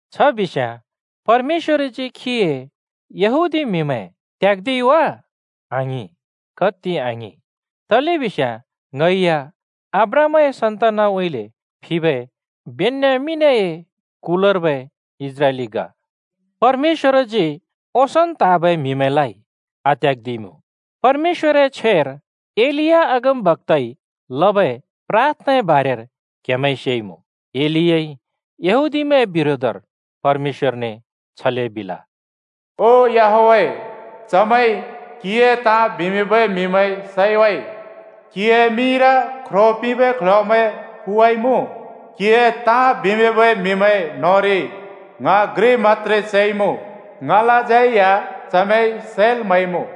छ बिस्‍याँ परमेश्‍वरजी खीए यहूदी म्‍हिमैं त्‍याग्‍दिइ वा? आङिं, कत्ति आङिं! तलेबिस्याँ ङै या अब्राहमए सन्तानउँइँले फिबै बेन्‍यामिनए कुलर्बै इस्राइलि ग। परमेश्‍वरजी ओंसोंन् त्हाँबै म्‍हिमैंलाइ आत्‍याग्‍दिइमुँ। परमेश्‍वरए छ्वेर एलिया अगमबक्‍ताइ लबै प्राथनाए बारेर क्‍हेमैंइ सेइमुँ। एलियाइ यहूदीमैंए बिरोधर परमेश्‍वरने छले बिल, “ओ याहवेह, चमैंइ क्‍हिए ताँ बिमिंबै म्‍हिमैं सैवाइ, क्‍हिए मिंर ख्रो पिंबै क्ल्ह्‍योमैं फुवाइमुँ। क्हिए ताँ बिमिंबै म्‍हिमैं न्‍होंरि ङ घ्रि मत्‍त्रे चैमुँ, ङलाज्यै या चमैंइ सैल् म्‍हैइमुँ।”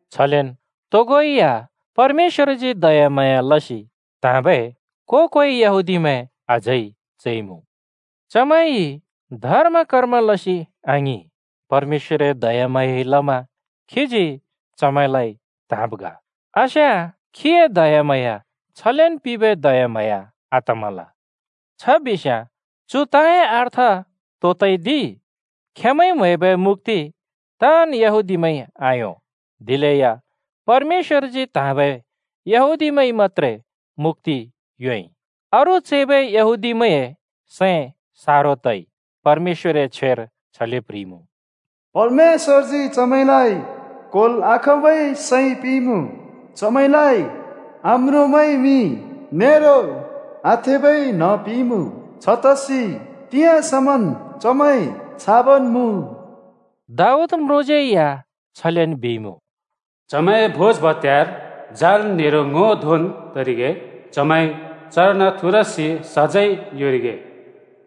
छलेन तोगो या परमेश्‍वरजी दयाम्हाँया लसि त्हाँबै को-कोइ यहूदीमैं अझै चैइमुँ। चमैंइ धर्म-कर्म लसि आङिं, परमेश्‍वरए दयाम्हाँयाइ लमा खीजी चमैंलाइ त्‍हाँब् ग, आस्याँ खीए दयाम्हाँया छलेन् पिंबै दयाम्हाँया आतमल। छ बिस्‍याँ चु ताँए अर्थ तो तइ दि? खेंमैंइ म्‍हैबै मुक्‍ति ताँन् यहूदीमैंइ आयों। दिलेया परमेश्‍वरजी त्‍हाँबै यहूदीमैंइ मत्‍त्रे मुक्‍ति योंइ। अरू चैबै यहूदीमैंए सैं सारो तइ। परमेश्‍वरए छ्वेर छले प्ह्रिइमुँ, “परमेश्‍वरजी चमैंलाइ क्होल् आखाँबै सैं पिंइमुँ, चमैंलाइ आम्रोंबै मि नेरो आथेबै न्ह पिंइमुँ, छतसि तिंयाँ समन् चमैं छाबन् मुँ।” दाऊद म्रुँज्यै या छलेन् बिइमुँ, “चमैंए भोज भत्‍यार जाल नेरो ङो धोंन् तरिगे, चमैं चर्न थुरसि सजैं योंरिगे।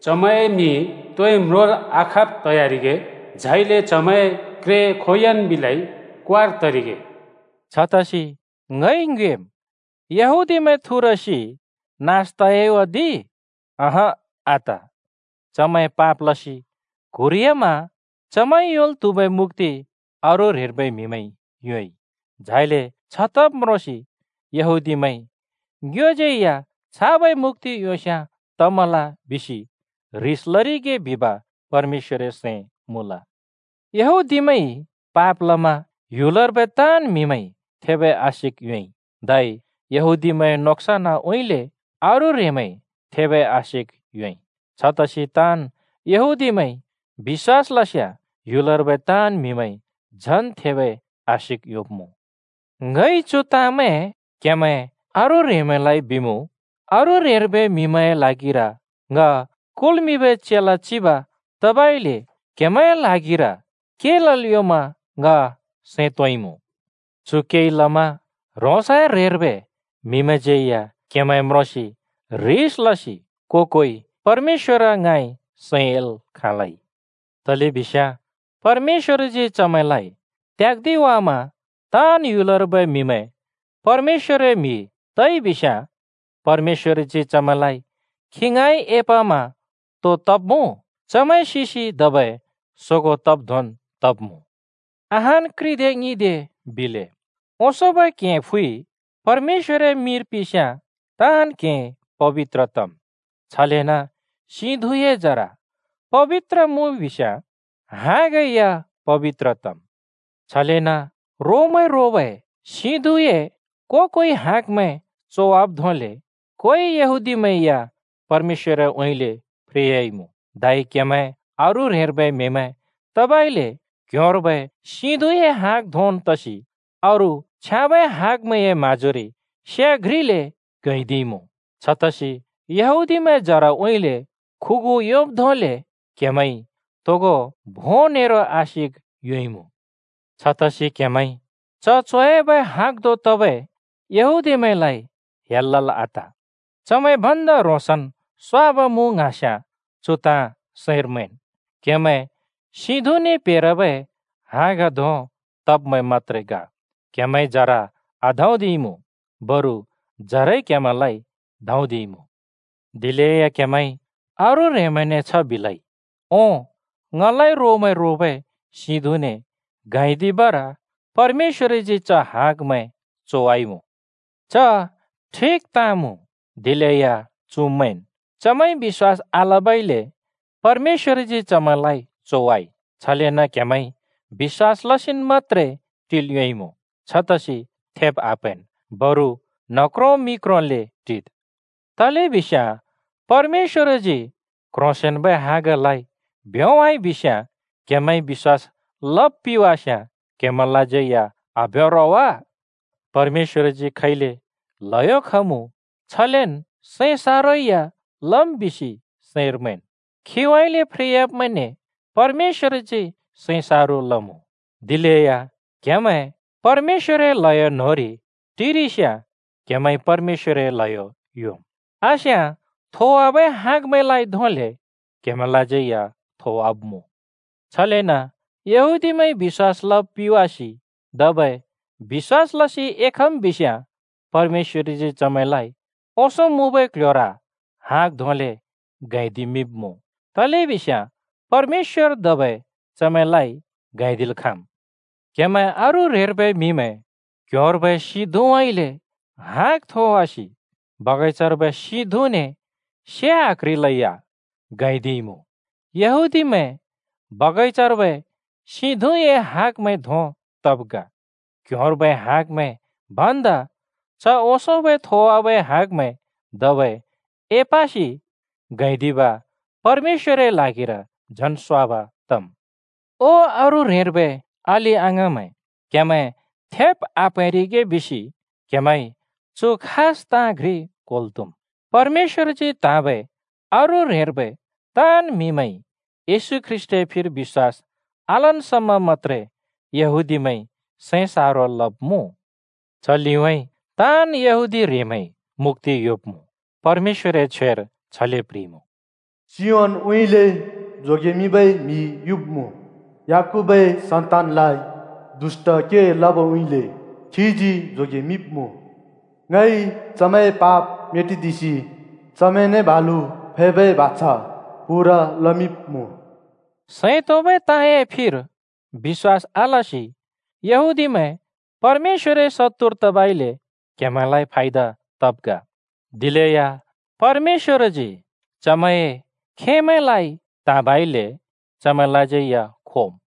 चमैंए मि तोइ म्रोंल् आखाँब् तयारिगे, झाइले चमैंए क्रे खोंयोंन् बिलै क्वार् तरिगे।” छतसि ङइ ङ्योएम्, “यहूदीमैं थुरसि नास तयाइ वा दि?” अँहँ, आत! चमैं पाप लसि क्‍हुरियामा चमैंइ योंल् त्‍हुबै मुक्‍ति अरू ह्रेंर्बै म्‍हिमैंइ योंइ। झाइले छ तब् म्रोंसि यहूदीमैंइ “ङ्योज्यै छाबै मुक्‍ति योंस्‍याँ तमल,” बिसि ह्रिस लरिगे बिब परमेश्‍वरए सैं मुँल। यहूदीमैंइ पाप लमा ह्‍युलर्बै ताँन् म्‍हिमैंइ थेबै आशिक योंइ, धै यहूदीमैंए नोक्सनउँइँले अरू ह्रेंमैंइ थेबै आशिक योंइ। छतसि ताँन् यहूदीमैंइ बिश्‍वास लस्‍याँ ह्‍युलर्बै ताँन् म्‍हिमैंइ झन् थेबै आशिक योंब्‍मुँ। ङइ चु ताँमैं क्‍हेमैं अरू ह्रेंमैंलाइ बिमुँ: अरू ह्रेंर्बै म्‍हिमैंए ल्हागिर ङ कुल्मिंबै चेला चिब तबइले क्हेमैंए ल्हागिर के लल् योंमा ङ सैं तोंइमुँ। चु केइ लमा ह्रोंसए ह्रेंर्बै म्‍हिमैंज्‍यै या क्‍हेमैं म्रोंसि ह्रिस लसि को-कोइ परमेश्‍वर ङाँइ सैं एल् खाँलै। तलेबिस्याँ परमेश्‍वरजी चमैंलाइ त्‍याग्‍दिवामा ताँन् ह्‍युलर्बै म्‍हिमैं परमेश्‍वरए म्‍हि तइबिस्‍याँ परमेश्‍वरजी चमैंलाइ खी ङाँइ एपमा तो तब्‍मुँ? चमैं सिसि धबै सोगों तब् धोंन् तब्‍मुँ। अहान् घ्रिदे ङ्हिंदे बिले: ओंसोंबै क्‍हें फ्‍वि परमेश्‍वरए मिंर पिंस्‍याँ ताँन् क्‍हें पबित्र तम्। छलेन सिं धुँए जरा पबित्र मुँ बिस्‍याँ हाँगै या पबित्र तम्। छलेन रोमैं रोबै सिं धुँए को-कोइ हाँगमैं चोवाब् धोंले कोइ यहूदीमैं या परमेश्‍वरउँइँले फ्रेयाइमुँ। धै क्‍हेमैं अरू ह्रेंर्बै म्‍हिमैं तबइले क्ह्‍योंर्बै सिं धुँए हाँग धोंन् तसि अरू छ्याँबै हाँगमैंए माँजोरि से घ्रिले गैंदिइमुँ। छतसि यहूदीमैंए जराउँइँले खुगु योंब् धोंले क्‍हेमैंइ तोगो भों नेरो आशिक योंइमुँ। छतसि क्‍हेमैं च चोयाबै हाँग धों तबै यहूदीमैंलाइ हेल लल् आत। चमैं भन्दा ह्रोंसन् स्‍वाब मुँ ङ्हाँस्‍याँ, चु ताँ सैंर मैंन्: क्‍हेमैं सिं धुँने प्हेरबै हाँग धों तब्मैं मत्‍त्रे ग। क्‍हेमैंइ जरा आधाँदिइमुँ, बरु जराइ क्‍हेमैंलाइ धाँदिइमुँ। दिलेया क्‍हेमैंइ अरू ह्रेंमैंने छ बिलै, “ओं, ङलाइ रोमैं रोबै सिं धुँने गैंदिबर परमेश्‍वरजी च हाँगमैं चोवाइमुँ।” च ठिक ताँ मुँ, दिलेया चु मैंन्: चमैंइ बिश्‍वास आलबइले परमेश्‍वरजी चमैंलाइ चोवाइ। छलेन क्‍हेमैंइ बिश्‍वास लसिन् मत्‍त्रे टिल् योंइमुँ। छतसि थेब् आप्हैंन्, बरु न्ह क्रों मि क्रोंले टिद्। तलेबिस्याँ परमेश्‍वरजी क्‍ह्रोंसेंन्‍बै हाँगलाइ भ्‍योंवाइ बिस्याँ, क्‍हेमैंइ बिश्‍वास लब् पिवास्‍याँ क्‍हेमैंलाज्यै या आभ्‍यों रो वा? परमेश्‍वरजी खैले ल्हयो खमुँ, छलेन सैं सारो या लम् बिसि सैंर मैंन्। खीउँइँले फ्रेयाब्‍मैंने परमेश्‍वरजी सैं सारो लमुँ, दिलेया क्‍हेमैं परमेश्‍वरए ल्हयो न्होंरि टिरिस्‍याँ क्‍हेमैंइ परमेश्‍वरए ल्हयो योंम्। आस्‍याँ थोवाबै हाँगमैंलाइ धोंले क्हेमैंलाज्यै या थोवाब्‍मुँ। छलेन यहूदीमैंइ अबिश्‍वास लब् पिवासि धबै बिश्‍वास लसि एखम् बिस्‍याँ परमेश्‍वरजी चमैंलाइ ओंसों मुँबै क्‍ल्‍ह्‍योर हाँग धोंले गैंदिमिंब्‍मुँ, तलेबिस्याँ परमेश्‍वर धबै चमैंलाइ गैंदिल् खाँम्। क्‍हेमैं अरू ह्रेंर्बै म्‍हिमैं क्ह्‍योंर्बै सिं धुँउँइँले हाँग थोवासि बगैंचार्बै सिं धुँने से आक्ह्रिलेया गैंदिइमुँ। यहूदीमैं बगैंचार्बै सिं धुँए हाँगमैं धों तब् ग। क्ह्‍योंर्बै हाँगमैं भन्दा च ओंसों थोवाबै हाँगमैं धबै एपसि गैंदिब परमेश्‍वरए ल्हागिर झन् स्वाब तम्। ओ अरू ह्रेंर्बै अलि-अङाँमैं, क्‍हेमैं थेब आप्हैंरिगे बिसि क्हेमैंइ चु खास ताँ घ्रि क्होल् त्हुम्: परमेश्‍वरजी त्‍हाँबै अरू ह्रेंर्बै ताँन् म्‍हिमैंइ येशू ख्रीष्‍टए फिर बिश्‍वास आलन् समा मत्‍त्रे यहूदीमैंइ सैं सारो लब्मुँ। च लिउँइँ ताँन् यहूदी ह्रेंमैंइ मुक्‍ति योंब्‍मुँ। परमेश्‍वरए छ्वेर छले प्ह्रिइमुँ: “सियोनउँइँले जोगेमिंबै म्‍हि युब्‍मुँ, याकूबए सन्तानलाइ दुष्‍ट के लबउँइँले खीजी जोगेमिंब्‍मुँ। ङइ चमैंए पाप मेटिदिसि चमैंने बालु फैबै बाछा पूरा लमिंब्‍मुँ।” सैं तोंबै ताँए फिर बिश्‍वास आलसि यहूदीमैं परमेश्‍वरए शत्तुर तबइले क्‍हेमैंलाइ फायदा तब् ग। दिलेया परमेश्‍वरजी चमैंए खेमैंलाइ त्‍हाँबइले चमैंलाज्यै या खोम्।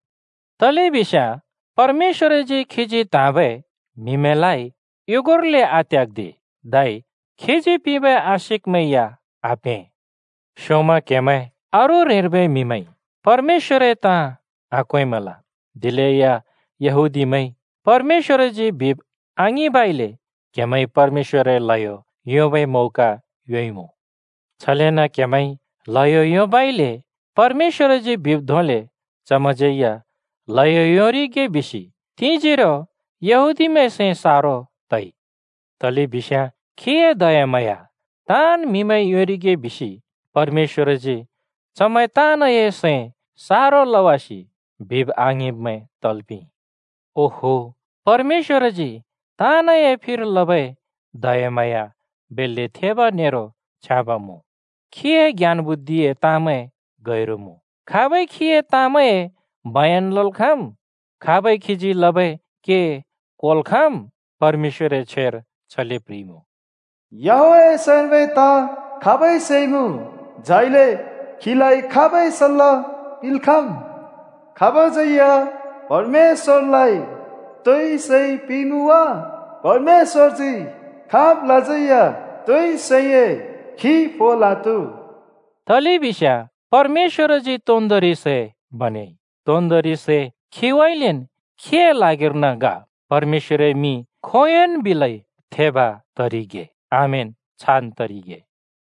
तलेबिस्याँ परमेश्‍वरजी खीजी त्‍हाँबै म्हिमैंलाइ युगुर्ले आत्‍याग्‍दि, धै खीजी पिंबै आशिकमैं या आप्हें। स्‍योंम क्‍हेमैं अरू ह्रेंर्बै म्‍हिमैंइ परमेश्‍वरए ताँ आक्वेंमल, दिलेया यहूदीमैंइ परमेश्‍वरजी बिब् आङिंबइले क्‍हेमैंइ परमेश्‍वरए ल्हयो योंबै मौका योंइमुँ। छलेन क्‍हेमैंइ ल्हयो योंबइले परमेश्‍वरजी बिब् धोंले चमैंज्यै या ल्हयो योंरिगे बिसि तिंजोरो यहूदीमैंए सैं सारो तइ। तलेबिस्याँ खीए दयाम्हाँया ताँन् म्‍हिमैंइ योंरिगे बिसि परमेश्‍वरजी चमैं ताँनए सैं सारो लवासि बिब् आङिंब्मैं तल् पिंइ। ओहो, परमेश्‍वरजी ताँनए फिर लबै दयाम्हाँया बेल्‍ले थेब नेरो छ्याँब मुँ। खीए ज्ञान बुद्धिए ताँमैं गैरु मुँ। खाबइ खीए ताँमैंए बयन लल् खाँम्? खाबइ खीजी लबै के क्‍होल् खाँम्? परमेश्‍वरए छ्वेर छले प्ह्रिइमुँ, “याहवेहए सैंर्बै ताँ खाबइ सेइमुँ? झाइले खीलाइ खाबइ सल्‍ला पिंल् खाँम्?” “खाबज्यै या परमेश्‍वरलाइ तोइ सै पिंइमुँ वा? परमेश्‍वरजी खाबलाज्यै तोइ सैए खि फोल् आत्‍हु।” तलेबिस्याँ परमेश्‍वरजी तोन्दोंरि सै बनेइ, तोन्दोंरि सै खीउँइँलेन् खीए ल्हागिर्न ग। परमेश्‍वरए मिं खोंयोंन् बिलै थेब तरिगे। आमेन, छान् तरिगे।